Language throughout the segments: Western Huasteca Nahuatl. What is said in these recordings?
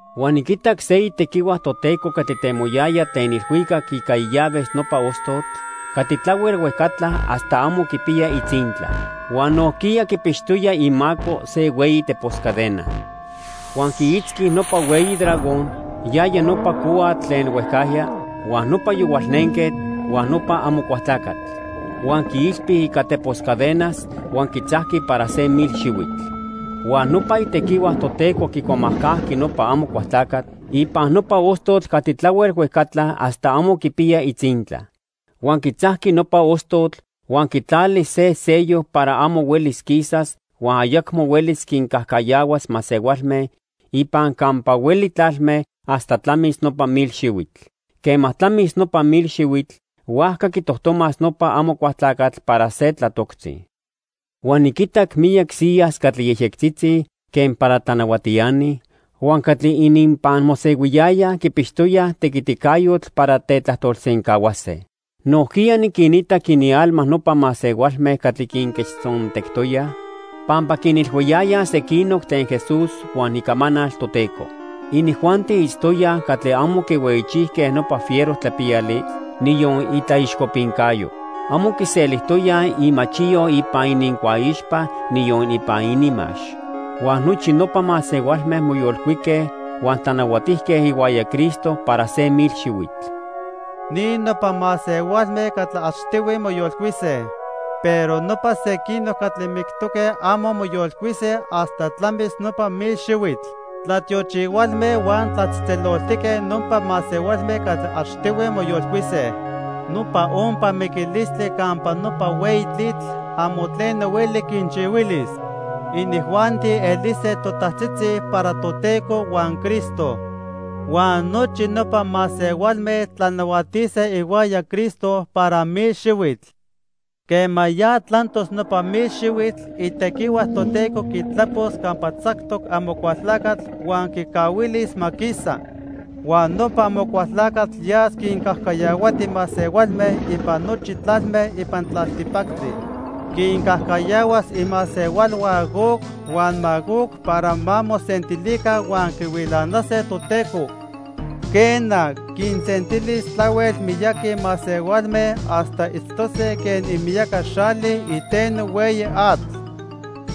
Huan niquitac se itequihua Toteco catli temoyaya tlen ilhuicac ica illaves nopa ostotl catli tlahuel huejcatla hasta amo quipiya itzintla. Huan nojquiya quipixtoya imaco se hueyi tepos cadena. Huan quiitzqui nopa hueyi dragón, yaya nopa cohuatl tlen huejcajya, huan nopa Yohualnenquetl, huan nopa Amocualtlacatl. Huan quiilpi ica tepos cadenas huan quitzajqui para se mil xihuitl. Huan nopa itequihua Toteco quicuamajcajqui nopa Amocualtlacatl ipan nopa ostotl catli tlahuel huejcatla hasta amo quipiya itzintla. Huan quitzajqui nopa ostotl huan quitlali se sello para amo huelis quisas huan ayacmo huelis quincajcayahuas masehualme ipan campa hueli tlalme hasta tlamis nopa mil xihuitl. Quema tlamis nopa mil xihuitl, huajca quitojtomas nopa Amocualtlacatl para se tlatoctzi. Huan niquitac miyac siyas catli yejyectzitzi quen para tlanahuatiani huan catli ininpan mosehuiyayaj quipixtoyaj tequiticayotl para tetlajtolsencahuase. Nojquiya niquinitac inialma nopa masehualme catli quinquechtzontectoyaj pampa quinilhuiyayaj sequinoc tlen Jesús huan icamanal Toteco. Inijuanti itztoyaj catli amo quihueyichijque nopa fiero tlapiyali, niyon itlaixcopincayo. Amo quiselijtoyaj imachiyo ipan inincuaixpa, niyon ipan ininmax. Huan nochi nopa masehualme moyolcuique huan tlanahuatijque ihuaya Cristo para se mil xihuitl. Ni nopa masehualme catli achtihui moyolcuise. Pero nopa sequinoc catli mictoque amo moyolcuise hasta tlamis nopa mil xihuitl. Tlatiochihualme huan tlatzejtzeloltique nopa masehualme catli achtihui moyolcuise. Nopa ompa miquilistli campa nopa hueyi tlitl amo tleno hueli quinchihuilis. Inijuanti elise totajtzitzi para Toteco huan Cristo. Huan nochi nopa masehualme tlanahuatise ihuaya Cristo para mil xihuitl. Quema ya tlantos nopa mil xihuitl, itequihua Toteco quitlapos campa tzactoc Amocualtlacatl huan quicahuilis ma quisa. Huan nopa Amocualtlacatl yas quincajcayahuati masehualme ipan nochi tlalme ipan tlaltipactli. Quincajcayahuas imasehualhua Gog huan Magog para ma mosentilica huan quihuilanase Toteco. Quena, quinsentilis tlahuel miyaqui masehualme hasta itztose quen imiyaca xali iteno hueyi atl.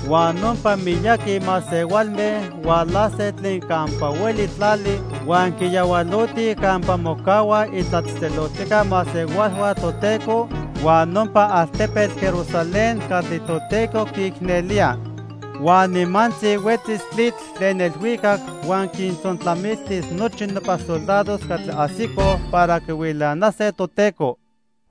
Huan nopa miyaqui masehualme hualase tlen campa hueli tlali huan quiyahualotij campa mocahuaj itlatzejtzeloltijca masehualhua Toteco huan nopa altepetl Jerusalén catli Toteco quiicnelía. Huan nimantzi huetzis tlitl tlen ilhuicac huan quintzontlamiltis nochi nopa soldados catli ajsicoj para quihuilanase Toteco.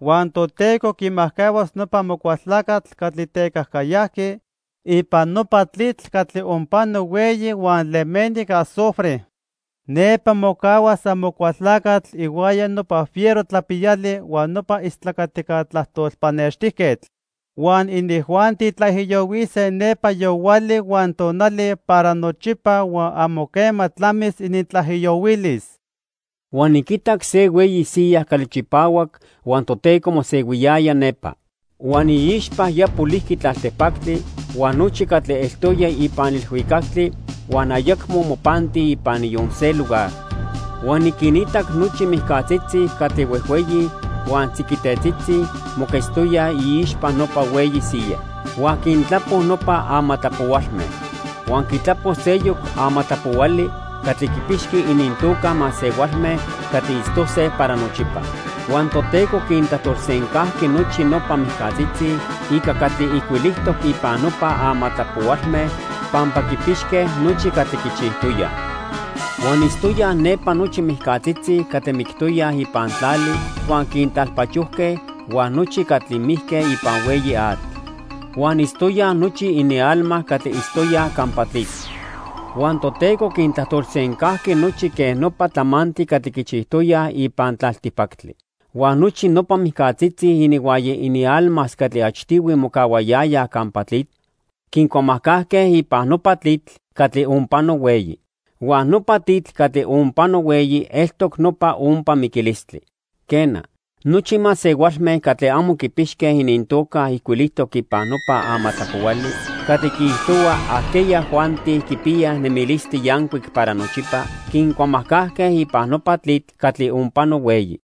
Huan Toteco quimajcahuas nopa Amocualtlacatl catli tecajcayajqui ipan nopa tlitl catli onpano hueyi huan lemeni ica azufre. Nepa mocahuas Amocualtlacatl ihuaya nopa fiero tlapiyali huan nopa istlacatica tlajtol pannextijquetl. Huan inijuanti tlaijiyohuise nepa yohuali huan tonali para nochipa huan amo quema tlamis inintlaijiyohuilis. Huan niquitac se hueyi siya catli chipahuac huan Toteco mosehuiyaya nepa. Huan iixpa ya polijqui tlaltipactli huan nochi catli eltoya ipan ilhuicactli huan ayacmo mopanti ipan niyon se lugar. Huan niquinitac nochi mijcatzitzi catli huejhueyi huan tziquitetzitzi moquetztoyaj iixpa nopa hueyi siya. Huan quintlapo nopa amatlapohualme. Huan quitlapo seyoc amatlapohuali catli quipixqui inintoca masehualme catli itztose para nochipa. Huan Toteco quintlajtolsencajqui nochi nopa mijcatzitzi ica catli ijcuilijtoc ipan nopa amatlapohualme pampa quipixque nochi catli quichijtoyaj. Huan itztoyaj nepa nochi mijcatzitzi catli mictoyaj ipan tlali huan quintlalpachojque huan nochi catli mijque ipan hueyi atl. Huan itztoyaj nochi inialma catli itztoyaj campa tlitl. Huan Toteco quintlajtolsencajqui nochi quen nopa tlamantli catli quichijtoyaj ipan tlaltipactli. Huan nochi nopa mijcatzitzi ininhuaya inialmas catli achtihui mocahuayayaj campa tlitl, quincuamajcajque ipan nopa tlitl catli onpano hueyi. Huan nopa tlitl catli onpano hueyi eltoc nopa ompa miquilistli. Quena, nochi masehualme catli amo quipixque inintoca ijcuilijtoc ipan nopa amatlapohuali catli quiijtohua ajqueyajuanti quipiyaj nemilistli yancuic para nochipa quincuamajcajque ipan nopa tlitl catli onpano hueyi.